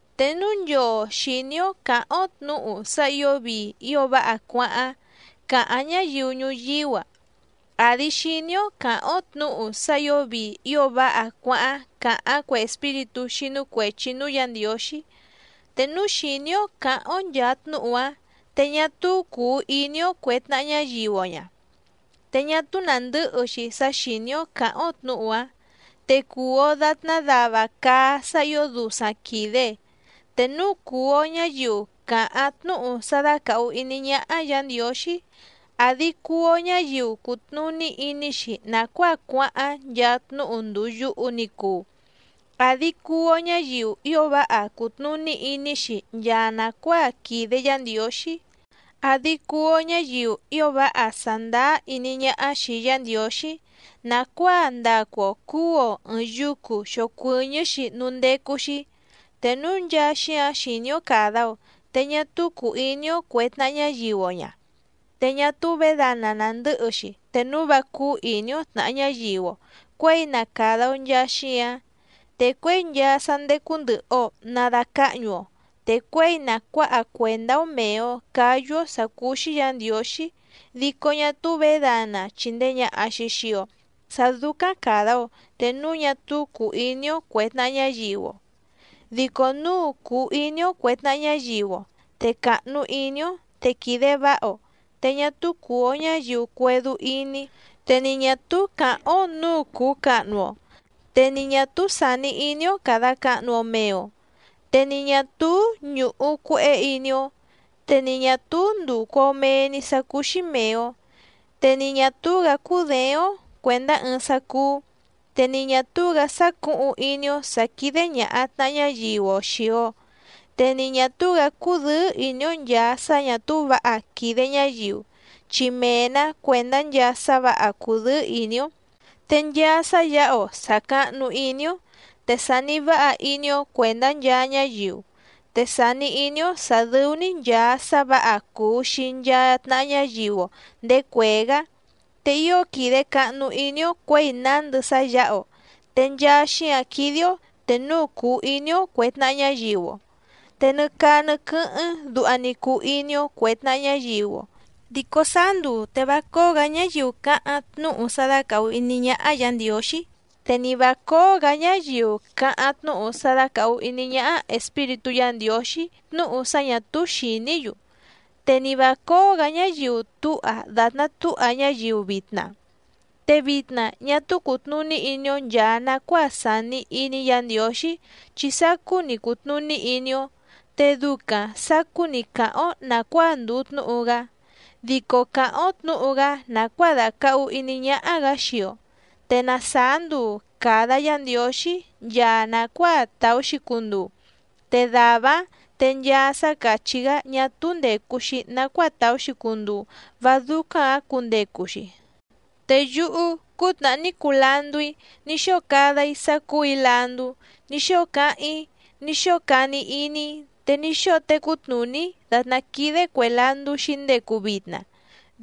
Te núu nchoo xìní‑ó cǎháⁿ‑ó tnǔhu sá ǐo vii ío váha cuáháⁿ càháⁿ ñáyiu ñuyíú‑a, àdi xiní‑ó cǎháⁿ‑ó tnǔhu sá ǐo vii ío váha cuáháⁿ càháⁿ cue espíritú xínú cuèchi núú Yǎ Ndiǒxí, te núu xìní‑ó cǎháⁿ‑ó nchàa tnúhu‑áⁿ te ñá túú cùu iní‑ó cuè tnaha ñáyiu‑o ña, te ñá túú nàndɨ́hɨ‑xi sá xìní‑ó cǎháⁿ‑ó tnǔhu‑áⁿ te cùu‑o datná dava caá sá ǐo dusaⁿ quìde. Te núu cùu‑o ñáyiu càháⁿ tnúhu sá dácàhu iní ñáhá Yǎ Ndiǒxí, àdi cuu‑o ñáyiu cùtnuní iní‑xi nàcuáa cuáháⁿ nchaa tnúhu ndùu yuhu ni cuu, àdi cuu‑o ñáyiu ío váha cùtnuní iní‑xi nchaa nàcuáa quìde Yá Ndiǒxí, àdi cuu‑o ñáyiu ío váha sàndáá iní ñáhá xìi Yá Ndiǒxí nàcuáa ndacu‑o cǔu‑o ɨ̀ɨⁿ yucu xocuɨñɨ́‑xi núú ndécú‑xí, te núu nchaa xíǎⁿ xìní‑ó càda‑o te ñá túú cùu iní‑ó cuè tnaha ñáyiu‑o ña, te ñá túú vědana nàndɨ́hɨ‑xi te núu vá cúú ìní‑ó tnàha ñáyiu‑o cuěi na càda‑o nchaa xíǎⁿ. Te cuěi nchaa sá ndécú ndɨ̀hɨ‑o na dacáhñu‑o, te cuěi na cuǎha cuèndá‑ó mèe‑o cáyú‑ó sǎ cúú‑xí Yǎ Ndiǒxí, dico ñá túú vědana chìndee ñaha‑xi xii‑o sá dúcáⁿ càda‑o te núu ñá túú cùu iní‑ó cuè tnaha ñáyiu‑o. Dico núu cùu iní‑ó cuè tnaha ñáyiu‑o, te càhnu iní‑ó, te quìde váha‑o, te ñá túú cùu‑o ñáyiu cuédú íní, te ni ñà túú càháⁿ‑ó nǔu cùu cahnu‑o, te ni ñà túú sàni iní‑ó càda cahnu‑o mee‑o, te ni ñà túú ñùhu cuehé iní‑ó, te ni ñà túú ndùcu‑o mee‑ni sá cúú‑xí mèe‑o, te ni ñà túú‑gǎ cúděéⁿ‑ó cuèndá ɨɨⁿ sá cúú, te ni ñà túú‑gǎ sácǔhuⁿ iní‑ó sǎ quídé ñàha tnaha ñáyiu‑o xìi‑o. Te ni ñà túú‑gǎ cúdɨ̌ɨ́ ìní‑ó nchàa sá ñà túú vǎha quìde ñáyiu, chi mee‑nǎ cuèndá nchaa sá vǎha cùdɨ́ɨ́ ìní‑ó. Te nchaa sá yǎha‑o sàcahnu iní‑ó, te sàni váha iní‑ó cuèndá nchaa ñáyiu, te sàni iní‑ó sǎ dɨ́ú‑ní nchàa sá vǎha cuu xii nchaa tnàha ñáyiu‑o ndèé cuèé‑gá, te ío quìde cahnu iní‑ó cuěi nándɨ sá yǎha‑o, te nchaa xíǎⁿ quídé‑ó te núu cùu iní‑ó cuè tnaha ñáyiu‑o. Te nɨ caa nɨ quɨ́hɨ́ⁿ duha‑ni cuu iní‑ó cuè tnaha ñáyiu‑o. Dico sáá nduu te vá cóó‑gǎ ñáyiu cáháⁿ tnúhu sá dácàhu iní ñáhá Yǎ Ndiǒxí, te ni vǎ cóó‑gǎ ñáyiu cáháⁿ tnúhu sá dácàhu iní ñáhá Espíritú Yǎ Ndiǒxí tnúhu sá ñà túú xìní‑yu, te ni vǎ cóó‑gǎ ñáyiu túha dàtná túha ñáyiu vitna. Te vitna ñá túú cùtnuní iní‑ó nchàa nacuáa sàni iní Yǎ Ndiǒxí chi sacú‑ni cùtnuní iní‑ó, te ducaⁿ sàcú‑ni càháⁿ‑ó nàcuáa ndùu tnúhu‑gá, dico càháⁿ‑ó tnǔhu‑gá nàcuáa dàcahu iní ñáhá‑gǎ xii‑o. Te na sàá nduu càda Yá Ndiǒxí nchaa nàcuáa tàú‑xi cunduu, te dàvá‑áⁿ te nchaa sá càchí‑gá ñá túú ndècu‑xi nacuáa tàú‑xi cunduu vá dúcáⁿ‑gǎ cundecu‑xi. Te yúhú cútnàhá ní cuu landú‑í ní xóo cada‑í sá cúù‑í landú, ní xóo cáháⁿ‑í, ní xóo cani iní‑í, te ní xóo tecú tnùní‑í dàtná quídé cuè landú xǐndecu vitna,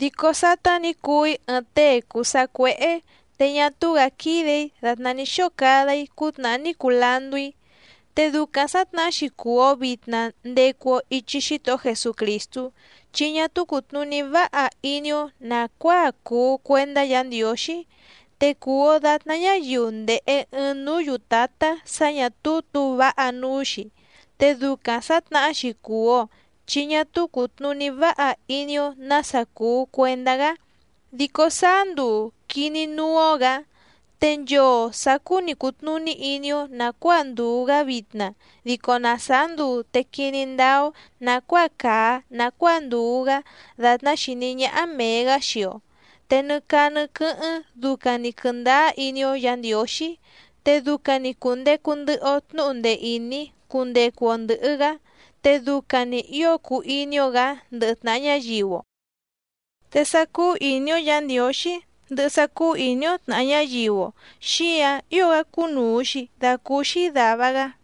dico sátá nǐ cuu‑í ɨɨⁿ tée cùu sacuéhé te ñá túú‑gǎ quídè‑í dàtná ní xóo cada‑í cútnàhá ní cuu landú‑í. Te ducaⁿ sǎtnahá‑xi cùu‑o vitna ndecu‑o ichi Xítohó Jesucrìstú, chi ñá túú cùtnuní váha iní‑ó nàcuáa cùu cuendá Yǎ Ndiǒxí, te cùu‑o datná ñáyiu ndèhe ɨɨⁿ núú yùtátá sǎ ñà túú tǔu váha núú‑xi, te ducaⁿ sǎtnahá‑xi cùu‑o chi ñá túú cùtnuní váha iní‑ó nǎsa cùu cuendá‑gá, dico sáá nduu quìní núú‑ó‑gǎ. Te nchoo sàcú‑ni cùtnuní iní‑ó nàcuáa ndùu‑gá vitna dico na sàá nduu te quiní ndáá‑ó nàcuáa càa nacuáa ndùu‑gá dàtná xìní ñáhá mèe‑gá xii‑o. Te nɨ caa nɨ quɨ́hɨ́ⁿ ducaⁿ‑ni quɨ̀ndáá iní‑ó Yǎ Ndiǒxí, te ducaⁿ‑ni cùndecu ndɨhɨ‑o tnúhu ndee ìní cundecu‑o ndɨ̀hɨ‑gá, te ducaⁿ‑ni ǐo cuu iní‑ó‑gǎ ndɨhɨ tnàha ñáyiu‑o. Te sá cúú ìní‑ó Yǎ Ndiǒxí ndɨhɨ sá cúú ìní‑ó tnàha ñáyiu‑o xíǎⁿ ío‑gá cúnùu‑xi dacúúxí dàva‑gá.